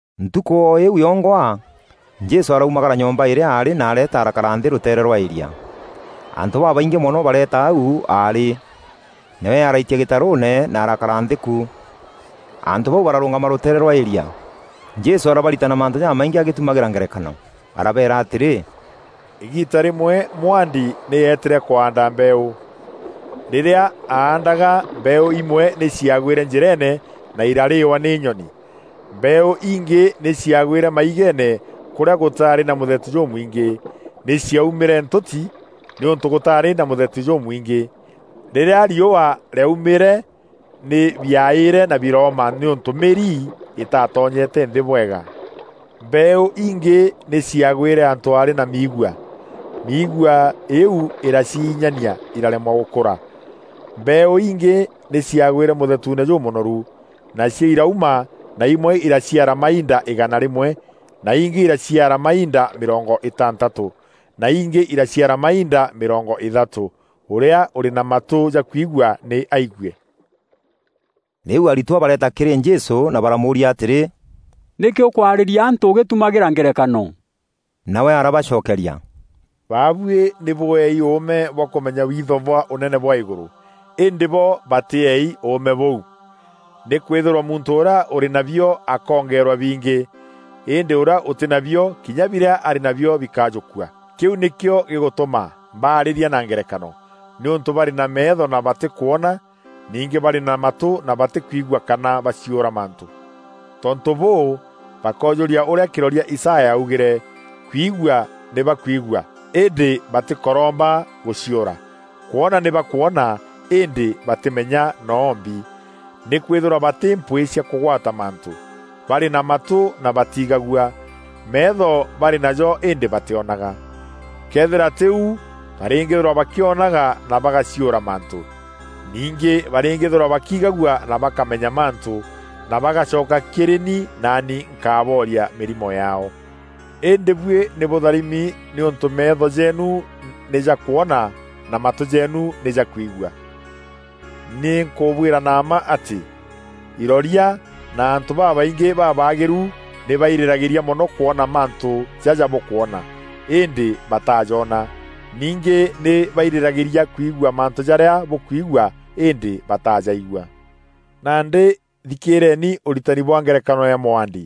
Ntukû o îîu yongwa, Jesû araumagara nyomba îrîa aarî na areeta arakara nthî rûteere rwa îria. Antû babaingî mono bareeta au aarî, nawe araitia gîtarûûne na arakara nthî ku. Antû bau bararûngama rûteere rwa îria. Jesû arabaritana mantû jamaingî agîtumagîra ngerekano. Arabeera atîrî, “Îgiita rîmwe mwaandi nî eetîre kwaanda mbeeû. Rîrîa aandaga, mbeeû imwe nî ciagwîre njîreene na irarîîwa nî nyoni. Mbeeû ingî nî ciagwîre maigeene kûrîa gûtaarî na mûthetu jûmwingî. Nî ciaumîre ntûti nîûntû gûtaarî na mûthetu jûmwingî. Rîrîa riûa rîaumîre nî biaîîre na birooma nîûntû mîri îtatonyete nthî bwega. Mbeeû ingî nî ciaagwîre antû aarî na miigua. Miigua îîu îraciinyanîa iraremwa gûkûra. Mbeeû ingî nî ciaagwîre mûthetuune jûmûnoru, nacio irauma na imwe iraciara mainda îgana rîmwe, na ingî iraciara mainda mîrongo îtantatû, na ingî iraciara mainda mîrongo îthatû. Ûrîa ûrî na matû jakwigua nî aigue.” Rîu aritwa bareeta kîrî Jesû na baramûûria atîrî, “Nîkî ûkwarîria antû ûgîtumagîra ngerekano?” Nawe arabacokeria, “Babuî nî bûeei ûûme bwa kûmenya witho bwa Ûnene bwa îgûrû, îndî bo batîeei ûûme bûu. Nîkwîthîrwa muntû ûrîa ûrî nabio akongeerwa bingî, îndî ûrîa ûtî nabio, kinya birîa arî nabio bikajûkua. Kîu nîkîo gîgûtûma mbaarîria na ngerekano nîûntû barî na meetho na batîkwona, ningî barî na matû na batîkwigua kana baciûra mantû. Tontû bûû bakoojûria ûrîa kîroria Isaya aaugîre: ‘Kwigua nî bakwigua îndî batîkoroomba gûciûra; kwona nî bakwona îndî batîmenya noo mbi. Nîkwîthîrwa batî mpwîî cia kûgwata mantû; barî na matû na batiigagua, meetho barî najo îndî batîonaga. Këethîra tî u, barîîngîîthîrwa bakîonaga na bagaciûra mantû, ningî barîngîîthîrwa bakiigagua na bakamenya mantû, na bagacoka kîrî ni naani nkabooria mîrimo yaao.’ Îndî buî nî bûtharimi nîûntû meetho jeenu nî jakwona na matû jeenu nî jakwigua. Nî nkûbwîra na mma atî, iroria na antû babaingî babaagîru nî bairîragîîria mono kwona mantû jaja bûkwona, îndî bataajona, ningî nî bairîragîîria kwigua mantû jarîa bûkwigua îndî batajaigua. “Nandî thikîîrieni ûritani bwa ngerekano ya mûandi.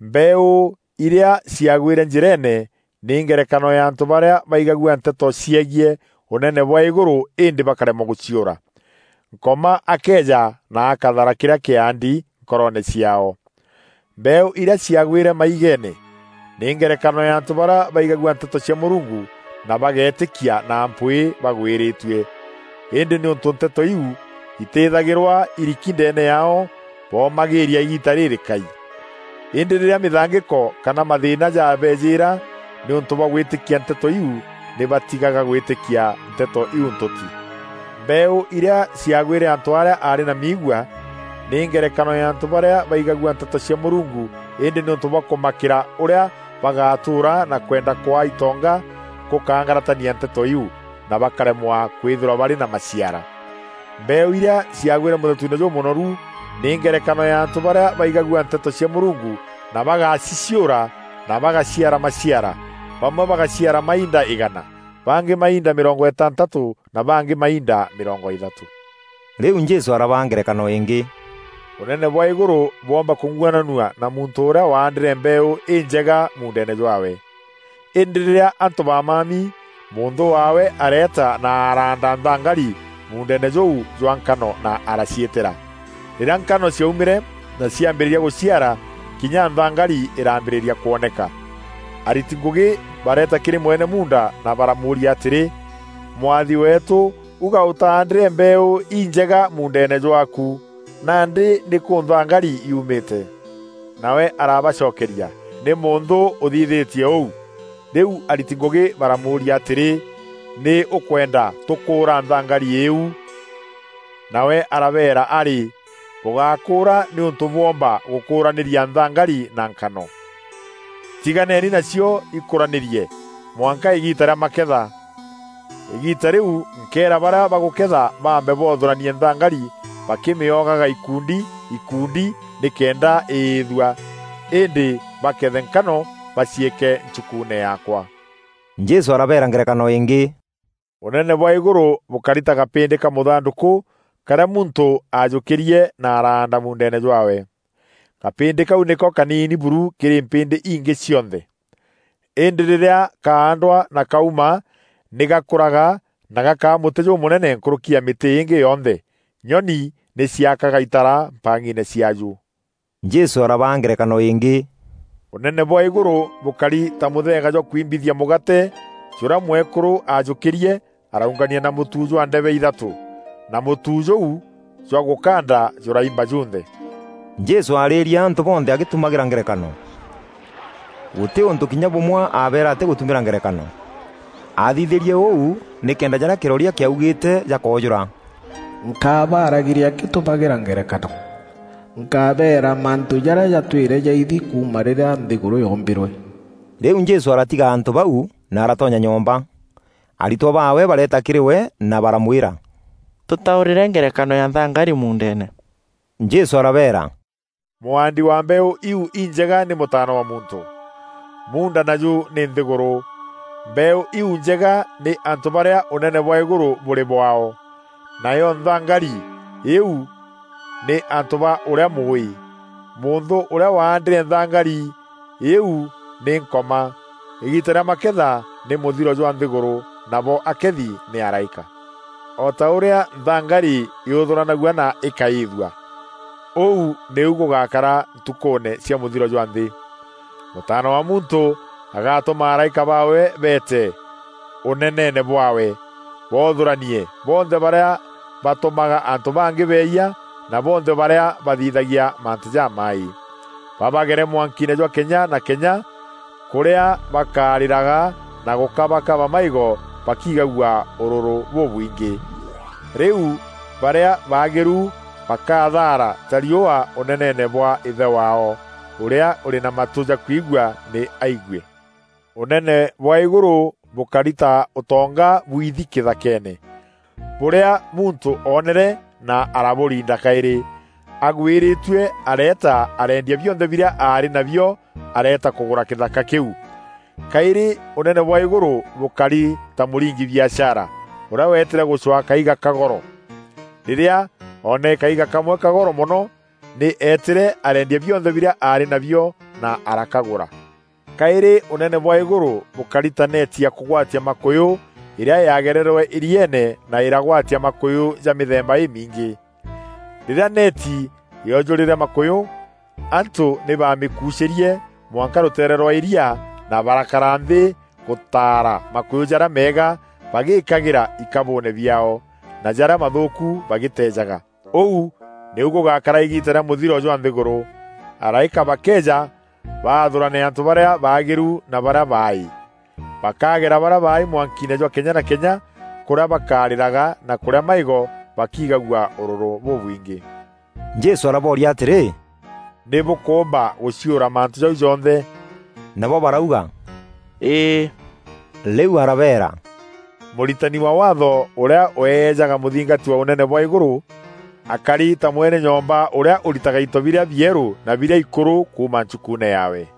Mbeeû irîa ciagwîre njîreene nî ngerekano ya antû barîa baigagua nteto ciegiî Ûnene bwa îgûrû îndî bakaremwa gûciûra. Nkoma akeeja na akathara kîrîa kîandi nkoroone ciaao. Mbeeû irîa ciaagwîre maigeene, nî ngerekano ya antû barîa baigagua nteto cia Mûrungu na bageetîkia na mpwîî bagwîrîtue. Îndî nîûntû nteto iu itîthagîrwa iriki ndeene yaao, boomagîîria îgiita rîrîkai. Îndî rîrîa mîthangîko kana mathîîna jabeejîîra nîûntû bwa gwîtîkia nteto iu, nî batigaga gwîtîkia nteto iu ntûti. Mbeeû irîa ciaagwîre antû arîa aarî na miigua, nî ngerekano ya antû barîa baigagua nteto cia Mûrungu îndî nîûntû bwa kûmakîra ûrîa bagatûûra na kwenda kwaa itonga, gûkaangaratania nteto iu, na bakaremwa kwîthîrwa barî na maciara. Mbeeû irîa ciaagwîre mûthetuune jûmûnoru nî ngerekano ya antû barîa baigagua nteto cia Mûrungu na bagaciciûra, na bagaciara maciara; bamwe bagaciara mainda îgana, bangî mainda mîrongo îtantatû na bangî mainda mîrongo îthatû.” Rîu Jesû arabaa ngerekano îngî: “Ûnene bwa îgûrû bwoomba kûng'uananua na muntû ûrîa waandîre mbeeû înjega muundeene jwaawe. Îndî rîrîa antû bamami, mûnthû waawe areeta na araanda nthangari muundeene jûu jwa nkano na araciîtîra. Rîrîa nkano ciaumîre na ciambîrîria gûciara, kinya nthangari îraambîrîria kwoneka. Ariti ngûgî bareeta kîrî mwene muunda na baramûûria atîrî, ‘Mwathi weetû, uga ûtaandîre mbeeû injega muundeene jwaaku? Nandî nîkû nthangari yuumîte?’ Nawe arabacokeria, ‘Nî mûnthû ûthithîtie ûu.’ Rîu ariti ngûgî baramûûria atîrî, ‘Nî ûkwenda tûkûûra nthangari îîu?’ Nawe arabeera, ‘Arî, bûgakûûra nîûntû bwoomba gûkûranîria nthangari na nkano. Tiganeni nacio ikûranîrie mwanka îgiita rîa maketha. Îgiita rîu nkeera barîa bagûkeetha baambe boothûranie nthangari bakîmîogaga ikundi ikundi nîkenda îîthua. Îndî bakethe nkano baciîke nchukuune yaakwa.’” Jesû arabeera ngerekano îngî: “Ûnene bwa îgûrû bûkari ta gapîndî ka mûthandûkû karîa muntû aajûkîrie na araanda muundeene jwaawe. Gapîndî kau nîko kaniini buru kîrî mpîndî ingî cionthe. Îndî rîrîa kaandwa na kauma nî gakûraga na gakaa mûtî jûmûnene nkûrûki ya mîtî îngî yonthe. Nyoni nî ciakaga itara mpang'iine ciaaju.” Jesû arabaa ngerekano îngî: “Ûnene bwa îgûrû bûkari ta mûtheega jwa kwimbithia mûgaate jûrîa mwekûrû aajûkîrie araungania na mûtu jwa ndebe ithatû, na mûtu jûu jwa gûkanda jûraimba jûnthe.” Jesû aarîrie antû bonthe agîtumagîra ngerekano. Gûtî ûntû kinya bûmwe abeera atîgûtumîra ngerekano. Aathithîrie ûu nîkenda jarîa kîroria kîaugîîte jakoojûra: “Nkaabaragîria ngîtumagîra ngerekano. Nkabeera mantû jarîa jatwîre jaithi kuuma rîrîa nthîgûrû yoombîrwe.” Rîu Jesû aratiga antû bau na aratonya nyomba. Aritwa baawe bareeta kîrî we na baramwîra, “Tûtaûrîre ngerekano ya nthangari muundeene.” Jesû arabeera, “Mûaandi wa mbeeû iu injega nî Mûtaana wa Muntû. Munda naju nî nthîgûrû. Mbeeû iu njega nî antû barîa Ûnene bwa îgûrû bûrî bwaao. Nayo nthangari îîu nî antû ba ûrîa Mûûî. Mûnthû ûrîa waandîre nthangari îîu nî Nkoma. Îgiita rîa maketha nî mûthiro jwa nthîgûrû, nabo akethi nî araîka. O ta ûrîa nthangari yûthûranagua na îkaîîthua, ûu nîu gûgakara ntukûûne cia mûthiro jwa nthî. Mûtaana wa Muntû agatûma araîka baawe beete Ûneneene bwaawe, boothûranie bonthe barîa batûmaga antû bangî beeyia na bonthe barîa bathithagia mantû jamaaî, babagere mwankiine jwa kenya na kenya, kûrîa bakarîraga na gûkabakaba maîgo bakiigagua ûrûrû bûbwingî. Rîu barîa baagîru bakathaara ta riûa Ûneneene bwa Îthe waao. Ûrîa ûrî na matû jakwigua nî aigue.” “Ûnene bwa îgûrû bûkari ta ûtonga bwithi kîthakeene, bûrîa muntû oonere na arabûriinda kaîrî. Agwîrîîtue areeta areendia bionthe birîa aarî nabio areeta kûgûra kîthaka kîu.” “Kaîrî Ûnene bwa îgûrû bûkari ta mûringi biashara ûrîa weetîre gûcwaa kaiga ka goro. Rîrîa oonere kaiga kamwe ka goro mono, nî eetîre areendia bionthe birîa aarî nabio na arakagûra.” “Kaîrî Ûnene bwa îgûrû bûkari ta neeti ya kûgwatia makûyû îrîa yaagererwe îrieene na îragwatia makûyû ja mîthemba îmingî. Rîrîa neeti yoojûrîre makûyû, antû nî bamîkuucîrie mwanka rûteere rwa îria na barakara nthî gûtaara makûyû jarîa meega bagîkagîra ikabûûne biaao, na jarîa mathûûku bagîteejaga. Ûu nîu gûgakara îgiita rîa mûthiro jwa nthîgûrû. Araîka bakeeja baathûrane antû barîa baagîru na barîa baaî. Bakagera barîa baaî mwankiine jwa kenya na kenya, kûrîa bakarîraga na kûrîa maîgo bakiigagua ûrûrû bûbwingî.” Jesû arabooria atîrî, “Nî bûkûumba gûciûra mantû jau jonthe?” Nabo barauga, “Îî.” Rîu arabeera, “Mûritani wa Waatho ûrîa weejaga mûthingati wa Ûnene bwa îgûrû, akari ta mwene nyomba ûrîa ûritaga into birîa bierû na birîa ikûrû kuuma nchukuune yaawe.”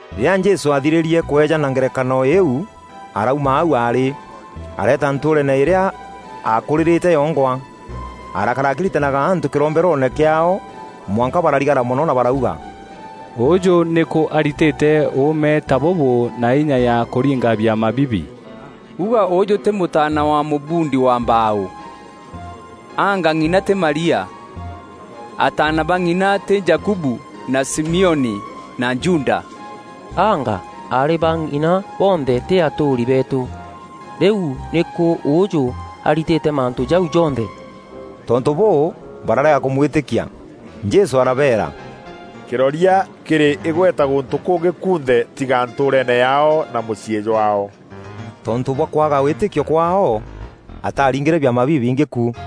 Rîrîa Jesû aathirîrie kweejana ngerekano iu, arauma au aarî, areeta ntûûreene îrîa aakûrîrîte yongwa. Arakara akîritanaga antû kîromberoone kîaao mwanka bararigara mono na barauga, “Ûûjû nîkû aritîte ûûme ta bûbû na inya ya kûringa biama bibi? Uga ûûjû tî mûtaana wa mûbundi wa mbaaû? Aanga ng'ina tî Maria? Ataana ba ng'ina tî Jakubu na Simioni na Juda? Aanga aarî ba ng'ina bonthe tî atûûri beetû? Rîu nîkû ûûjû aritîte mantû jau jonthe?” Tontû bûû, bararega kûmwîtîkia. Jesû arabeera, “Kîroria kîrî îgweta gûntû kûngî kunthe tîga ntûûreene yaao na mûciî jwaao.” Tontû bwa kwaaga wîtîkio kwaao, ataringîre biama bibingî ku.